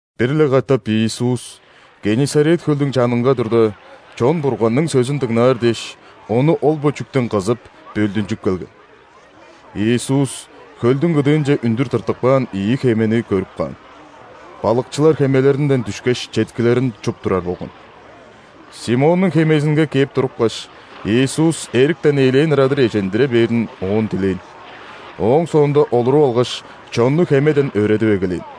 Бир-ле катап Иисус Геннисарет хөлдүң чанынга турда, чон Бурганның сөзүн дыңнаар дээш, Ону ол-бо чүктен кызып, бөлдүнчүп келген. Иисус хөлдүң кыдыынче үндүр тыртып каан ийи хемени көрүп каан. Балыкчылар хемелеринден дүшкеш, четкилерин чуп турар болган. Симоннуң хемезинге кээп турупкаш, Иисус эриктен элээн ырадыр эжиндире бээрин оон дилээн. Ооң соонда олуруп алгаш, чонну хемеден өөредип эгелээн.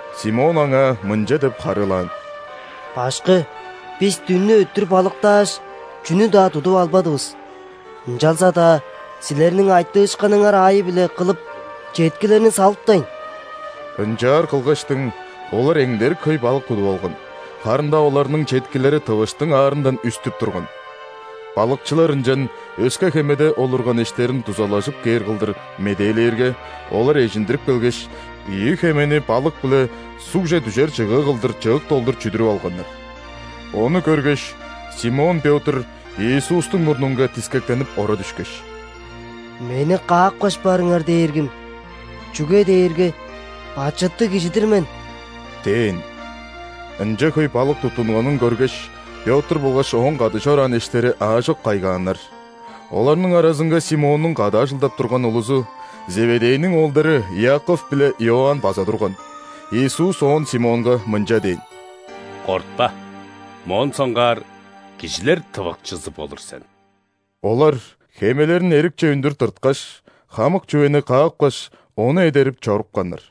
Симон Аңаа мынча деп харыылаан: «Башкы, бис дүннү өттүр балыктааш, чүнү-даа тудуп албадывыс. Ынчалза-даа Силерниң айтыышкыныңар аайы-биле кылып, четкилерни салыптайн». Ынчаар кылгаштың, олар эңдерик хөй балык тудуп алган, харын-даа оларның четкилери тывыштың аарындан үстүп турган. Балыкчылар ынчан өске хемеде олурган эштерин дузалажып кээр кылдыр медээлээрге, олар эжиндирип келгеш, ийи хемени балык-биле сугже дүжер чыгыы кылдыр чык долдур чүдүрүп алганнар. Ону көргеш, Симон Пётр Иисустуң мурнунга дискектенип ора дүшкеш: «Мени каапкаш барыңар, Дээргим! Чүге дээрге бачыттыг кижи-дир мен!» – дээн. Ынча хөй балык туттунганын көргеш, Пётр болгаш ооң кады чораан эштери аажок кайгааннар. Оларның аразынга Симоннуң кады ажылдап турган улузу – Зеведейниң оолдары Иаков биле Иоанн база турган. Иисус оон Симонга мынча дээн: «Кортпа, моон соңгаар кижилер тывыкчызы болур сен». Олар хемелерин эрикче үндүр тырткаш, хамык чүвени каапкаш, Ону эдерип чорупканнар.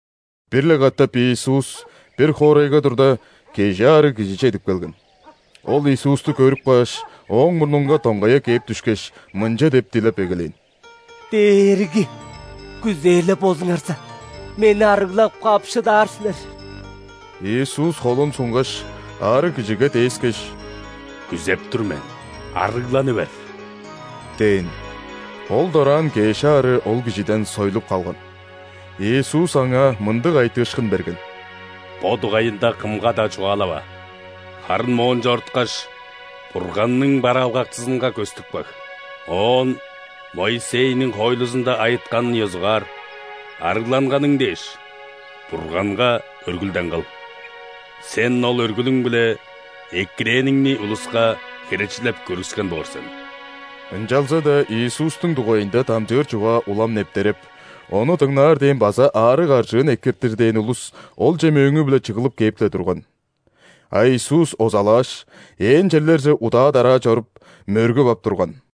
Бир-ле катап Иисус бир хоорайга турда, кежи аарыг кижи чедип келген. Ол Иисусту көрүп кааш, Ооң мурнунга доңгая кээп дүшкеш, мынча деп дилеп эгелээн: «Дээрги! Күзээр-ле болзуңарза, мени арыглап каап шыдаар силер». Иисус холун сунгаш, аарыг кижиге дээскеш: «Күзеп тур мен, арыгланы бер!» – дээн. Ол дораан кеш аарыы ол кижиден сойлуп калган. Иисус аңаа мындыг айтыышкын берген: «Бо дугайында кымга-даа чугаалава, харын моон чоруткаш, Бурганның бараалгакчызынга көстүп каг, оон Моисейниң хоойлузунда айытканын ёзугаар, ·арыгланганың дээш Бурганга өргүлден кыл. Сен ол өргүлүң-биле экирээниңни улуска херечилеп көргүскен боор сен». Ынчалза-даа Иисустуң дугайында дамчыыр чугаа улам нептереп, Ону дыңнаар дээн база аарыг-аржыын экиртир дээн улус Олче мөөңү-биле чыглып кээп-ле турган. А Иисус озалааш, ээн черлерже удаа-дараа чоруп, мөргүп ап турган.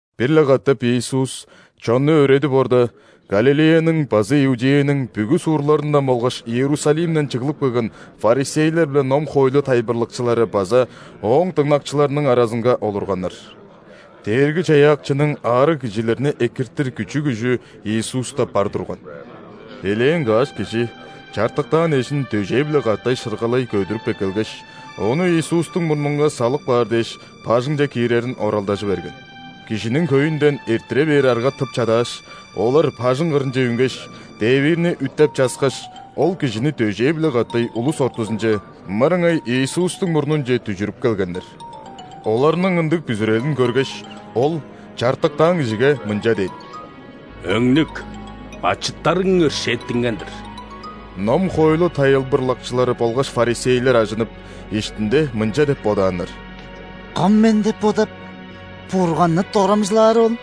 Бир-ле катап Иисус чонну өөредип орда, Галилеяның база Иудеяның бүгү суурларындан болгаш Иерусалимден чыглып келген ·фарисейлер биле ном-хоойлу тайылбырлакчылары база Ооң дыңнакчыларының аразынга олурганнар. Дээрги-Чаяакчының аарыг кижилерни экиртир күчү-күжү Иисуста бар турган. Элээн каш кижи чартыктаан эжин дөжээ-биле катай шыргалай көдүрүп эккелгеш, ону Иисустуң мурнунга салып каар дээш, бажыңче киирерин оралдажы берген. Кижиниң хөйүнден эрттире бээр арга тып чадааш, олар бажың кырынче үнгеш, дээвиирни үттеп-часкаш, ол кижини дөжээ-биле катай улус ортузунче, мырыңай Иисустуң мурнунче дүжүрүп келгеннер. Оларның ындыг бүзүрелин көргеш, Ол чартыктаан кижиге мынча дээн: «Өңнүк, бачыттарың өршээттинген-дир». Ном-хоойлу тайылбырлакчылары болгаш фарисейлер ажынып, иштинде мынча деп бодааннар: «Кым Мен деп бодап, Бурганны дорамчылаары ол?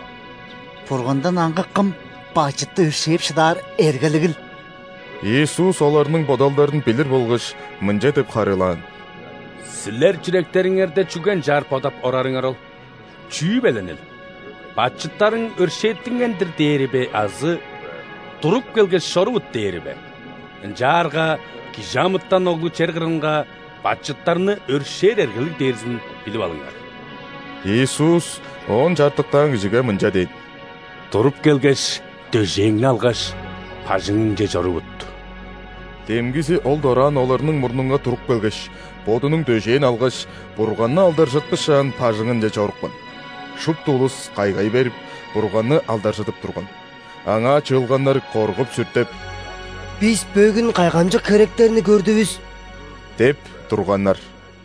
Бургандан аңгы кым бачытты өршээп шыдаар эргелигил?» Иисус оларның бодалдарын билир болгаш, мынча деп харыылаан: «Силер чүректериңерде чүге ынчаар бодап орарыңар ол? Чүү беленил? „Бачыттарың өршээттинген-дир“ – дээри бе азы: „Туруп келгеш, чорувут“ – дээри бе? Ынчаарга ·Кижи амытан Оглу чер кырынга бачыттарны өршээр эргелиг дээрзин билип алыңар...» – Иисус оон чартыктаан кижиге мынча дээн: «Туруп келгеш, дөжээңни алгаш, бажыңыңче чорувут!» Демгизи ол дораан оларның мурнунга туруп келгеш, бодунуң дөжээн алгаш, Бурганны алдаржытпышаан, бажыңынче чорупкан. Шупту улус кайгай берип, Бурганны алдаржыдып турган. Аңаа чыылганнар коргуп-сүртеп: «Бис бөгүн кайгамчык херектерни көрдүвүс!» – деп турганнар.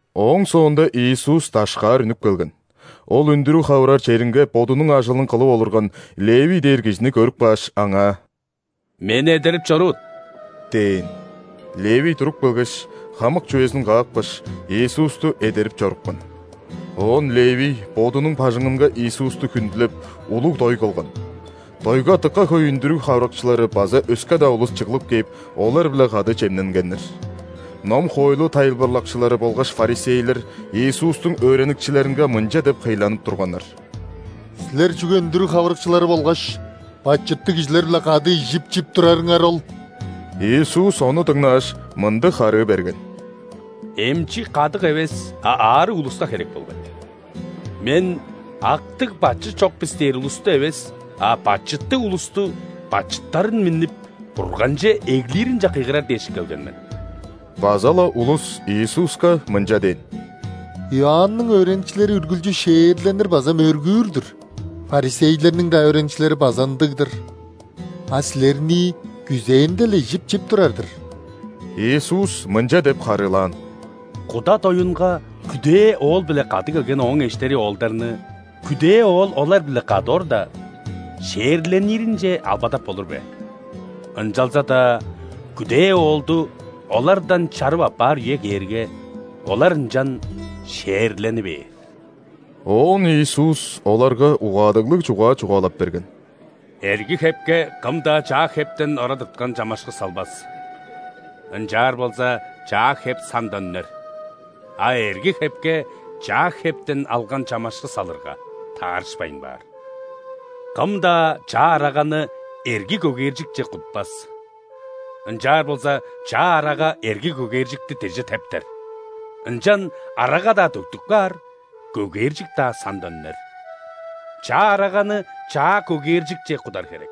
Ооң соонда Иисус дашкаар үнүп келген. Ол үндүрүг хавырар черинге бодунуң ажылын кылып олурган Левий дээр кижини көрүп кааш, аңаа: «Мени эдерип чорувут» – дээн. Левий туруп келгеш, хамык чүвезин каапкаш, Иисусту эдерип чорупкан. Оон Левий бодунуң бажыңынга Иисусту хүндүлеп, улуг дой кылган. Дойга дыка хөй үндүрүг хавырыкчылары база өске-даа улус чыглып кээп, олар-биле кады чемненгеннер. Ном-хоойлу тайылбырлакчылары болгаш фарисейлер Иисустуң өөреникчилеринге мынча деп хыйланып турганнар: «Силер чүге үндүрүг хавырыкчылары болгаш бачыттыг кижилер-биле кады ижип-чип турарыңар ол?» Иисус ону дыңнааш, мындыг харыы берген: «Эмчи кадык эвес, а аарыг улуска херек болгай. Мен „Актыг, бачыт чок бис“ дээр улусту эвес, а бачыттыг улусту бачыттарын миннип, Бурганче эглиринче кыйгырар дээш келген мен!» База-ла улус Иисуска мынча дээн: «Иоанның өөреникчилери үргүлчү ·шээрленир база мөргүүр-дүр, ·фарисейлерниң-даа өөреникчилери база ындыг-дыр, а Силернии күзээнде-ле ижип-чип турар-дыр». Иисус мынча деп харыылаан: «Куда доюнга күдээ оол-биле кады келген ооң эштери оолдарны, күдээ оол олар-биле кады орда, ·шээрлениринче албадап болур бе? Ынчалза-даа күдээ оолду олардан чарып аппаар үе кээрге, олар ынчан шээрлени бээр». Оон Иисус оларга угаадыглыг чугаа чугаалап берген: «Эрги хепке кым-даа чаа хептен ора тырткан чамашкы салбас. Ынчаар болза, чаа хеп сандан үнер, а эрги хепке чаа хептен алган чамашкы салырга, таарышпайн баар. Кым-даа чаа араганы эрги көгээржикче кутпас. Ынчаар болза, чаа арага эрги көгээржикти деже тептер, ынчан арага-даа төктүп каар, көгээржик-даа сандан үнер. Чаа араганы чаа көгээржикче кудар херек.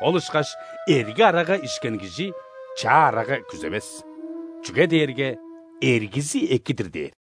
Ол ышкаш эрги арага ишкен кижи чаа арага күзевес, чүге дээрге: „Эргизи эки-дир“ – дээр».